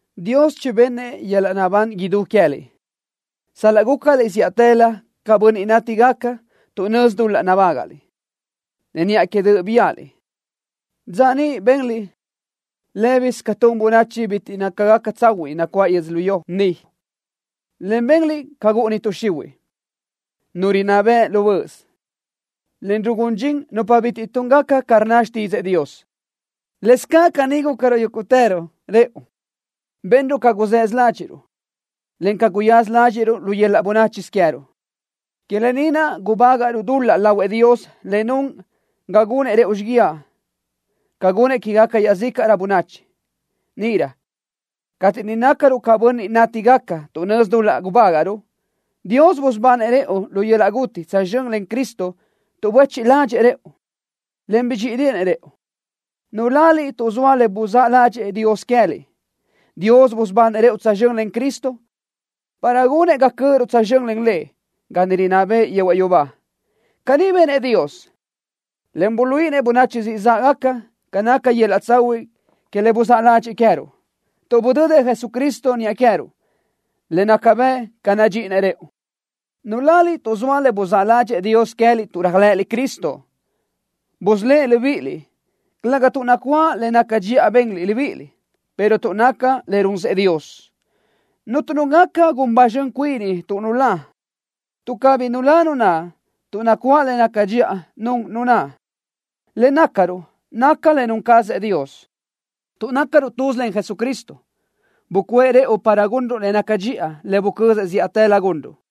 Dios chibennëʼ yöl-laʼ naʼbán idú queë́liʼ, sal-laʼ gúcaliʼ zíʼatëlö ca bönniʼ nátigaca tuʼ nözi dul-laʼ nabágaʼliʼ, en niʼa que döʼ biáʼaliʼ. Dza niʼ benliʼ lë́bisö ca tun bönachi bitiʼ nácagaca tsahuiʼ nacuáʼ yödzölió ni, en benliʼ ca gúʼuni tuʼ xihuiʼ, nu rinná bëʼ lu böʼös, en rugún dxin nupa bitiʼ túngaca ca rnna xtídzëʼë Dios. Lëscaʼ caní gúcaruʼ yúguʼtëruʼ rëʼu. Benruʼ ca guzësö ládxiʼruʼ, en ca guyaza ládxiʼruʼ lu yöl-laʼ bönáchisö queë́ruʼ. Que lë ni naʼ gubágaʼruʼ dul-laʼ lahuëʼ Dios le nun ga gunëʼ rëʼu xíguiaʼ ca gunëʼ quéguequi iaʼzícaʼrö bönachi. Níʼirö cateʼ niʼ nácaruʼ ca bönniʼ nátigaca tuʼ nözi dul-laʼ gubágaʼruʼ, Dios busubanëʼ rëʼu lu yöl-laʼ guti tsözxö́n len Cristo tuʼ buéchiʼ ládxëʼë rëʼu, en bidxíʼideʼenëʼ rëʼu. Nuláliʼ tuʼ zoa le buzáʼ ládxëʼë Dios queë́liʼ. Dios busubanëʼ rëʼu tsözxö́n len Cristo para gunëʼ ga cö́ʼöruʼ tsözxö́n len Lëʼ ga niʼ rinná bëʼë yehuaʼ yubá. Caní benëʼ Dios, en buluíʼinëʼ bönachi siʼ záʼgaca ca naca yöl-laʼ tsahuiʼ que le buzáʼ ládxëʼë queë́ruʼ, tuʼ budödëʼ Jesucristo niʼa queë́ruʼ, le naca bëʼ ca nadxíʼideʼenëʼ rëʼu. Nuláliʼ tuʼ zoa le buzáʼ ládxëʼë Dios queë́liʼ tuʼ réajlëʼëliʼ Cristo. Busölë́ʼ libíʼiliʼ, calëga tuʼ nacuáʼ le naca dxiʼa benliʼ libíʼiliʼ, pero tuʼ naca le runsëʼ Dios. Cuntu nu gaca gun ba zxön cuini tuʼ nulá, tuʼ cabí nulá nu naʼ tuʼ nacuáʼ le naca dxiʼa nun nu naʼ. Le nácaruʼ naca le nun cazëʼ Dios. Tuʼ nácaruʼ tuz len Jesucristo, bucuʼë rëʼu para gunruʼ le nácagaca dxiʼa, le bucözëʼ zíʼatëlö gunruʼ.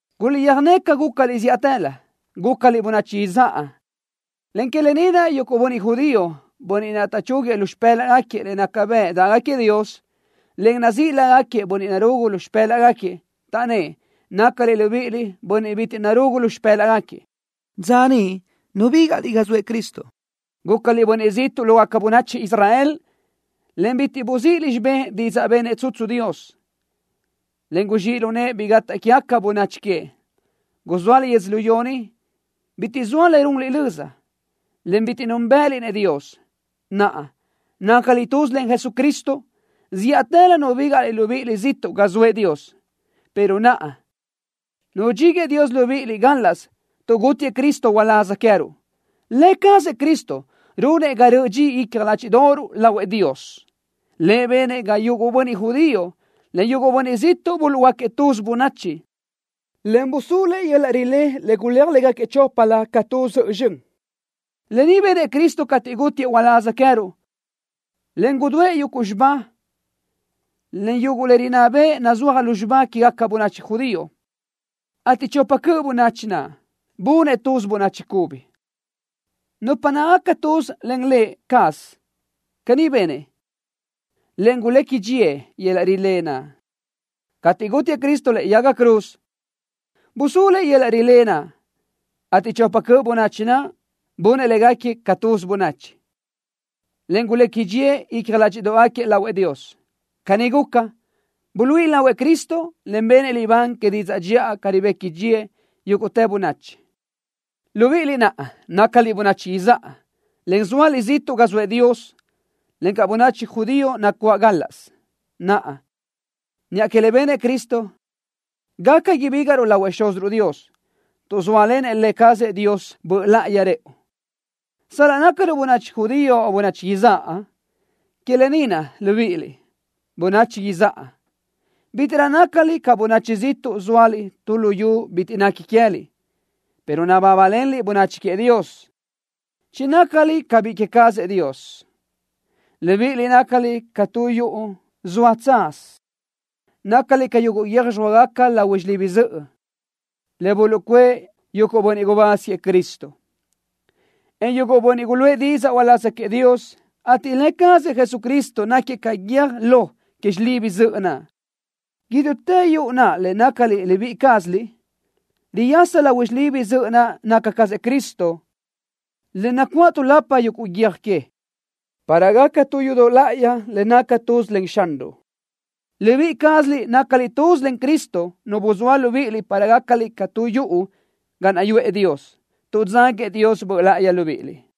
Guliʼtsöjné ca gúcaliʼ zíʼatëlö. Gúcaliʼ bönachi izáʼa, en que lë ni naʼ yuguʼ bönniʼ judío, bönniʼ naʼ taʼchúguiëʼ lu xipë́laʼgaquiëʼ le naca bëʼ dáʼgaquiëʼ Dios, en nazíʼ lágaquiëʼ bönniʼ narugu lu xipë́laʼgaquiëʼ, taʼnnë́ʼ nácaliʼ libíʼiliʼ bönniʼ bitiʼ narugu lu xipë́laʼgaquiëʼ. Dza niʼ nubígaʼliʼ ga zoëʼ Cristo. Gúcaliʼ bönniʼ ziʼtuʼ lógaca bönachi Israel, en bitiʼ buzíʼiliʼ xibé didzaʼ benëʼ tsutsu Dios, en guzxíʼ lu nëʼë bi gataʼ quégaca bönachi queëʼ. Guzóaliʼ yödzölió ni, bitiʼ zoa le runliʼ löza, en bitiʼ núnbëʼëniliʼ-nëʼ Dios. ¡Naʼa, nácaliʼ tuz len Jesucristo! ¡Zíʼatëlö nubígaʼliʼ libíʼiliʼ ziʼtuʼ ga zoëʼ Dios, pero naʼa nudxíguëʼë Dios libíʼiliʼ gálaʼsö tuʼ gútiëʼ Cristo uláz queë́ruʼ! Lë cazëʼ Cristo runëʼ ga röʼö dxi icja ládxiʼdoʼoruʼ lahuëʼ Dios. Lëʼ benëʼ ga yuguʼ bönniʼ judío, en yuguʼ bönniʼ ziʼtuʼ buluʼhuöáquiëʼ tuz bönachi, en busúluëʼ yöl-laʼ rilé le guléaj légaquiëʼ choplö ca tu zöʼö zxön. Lë ni benëʼ Cristo cateʼ gútiëʼ uláz queë́ruʼ, en gudúëʼ yuguʼ xibá, en yuguʼ le rinná bëʼ nazúajgaca lu xibá quégaca bönachi judío, ateʼ chopa cöʼ bönachi naʼ, bunëʼ tuz bönachi cubi, nupa nácagaca tuz len Lë cazëʼ. Caní benëʼ, en gulequi dxíëʼ yöl-laʼ rilé naʼ. Cateʼ gútiëʼ Cristo lëʼe yaga cruz, busúluëʼ yöl-laʼ rilé naʼ, ateʼ chopa cöʼ bönachi naʼ, bunëʼ légaquiëʼ ca tuz bönachi, en gulequi dxíëʼ icja ládxiʼdoʼgaquiëʼ lahuëʼ Dios. Caní guca, buluíʼi lahuëʼ Cristo, en benëʼ libán que didzaʼ dxiʼa ca ribequi dxíëʼ yúguʼtë bönachi, libíʼiliʼ naʼ nácaliʼ bönachi izáʼa, en zóaliʼ ziʼtuʼ ga zoëʼ Dios, encaʼ bönachi judío nacuáʼ gálaʼsö. Naʼa, niʼa que le benëʼ Cristo, gaca ibígaʼruʼ lahuëʼ Xúziruʼ Dios, tuʼ zóalenëʼ Lë cazëʼ Dios Böʼ Láʼayi rëʼu, sal-laʼ nácaruʼ bönachi judío o bönachi izáʼa. Que lë ni naʼ, libíʼiliʼ, bönachi izáʼa, bítiʼrö nácaliʼ ca bönachi ziʼtuʼ zóaliʼ tu luyú bitiʼ nequi queë́liʼ, pero nabábalenliʼ bönachi queëʼ Dios. ¡Chinácaliʼ ca biʼi queë cazëʼ Dios! Libíʼiliʼ nácaliʼ ca tu yuʼu zoa tsaz. Nácaliʼ ca yuguʼ guiö́j zxóagaca lahui xilibi zöʼö, le buluʼcuʼë yuguʼ bönniʼ gubáz queëʼ Cristo, en yuguʼ bönniʼ guluʼë didzaʼ uláz queëʼ Dios, ateʼ Lë cazëʼ Jesucristo náquiëʼ ca guiö́j lo que xilibi zöʼö naʼ. Idútë yuʼu naʼ le nácaliʼ libíʼi cázaliʼ riyasa lahui xilibi zöʼö naʼ naca cazëʼ Cristo, en nacuáʼ tuʼlapa yuguʼ guiö́j que, para gaca tu yudoʼ láʼayi le naca tuz len Xanruʼ. Libíʼi cázaliʼ nácaliʼ tuz len Cristo Nu buzóa libíʼiliʼ para gácaliʼ ca tu yuʼu ga naʼ yuʼë Dios, tuʼ dzáguëʼ Dios Böʼ Láʼayi libíʼiliʼ.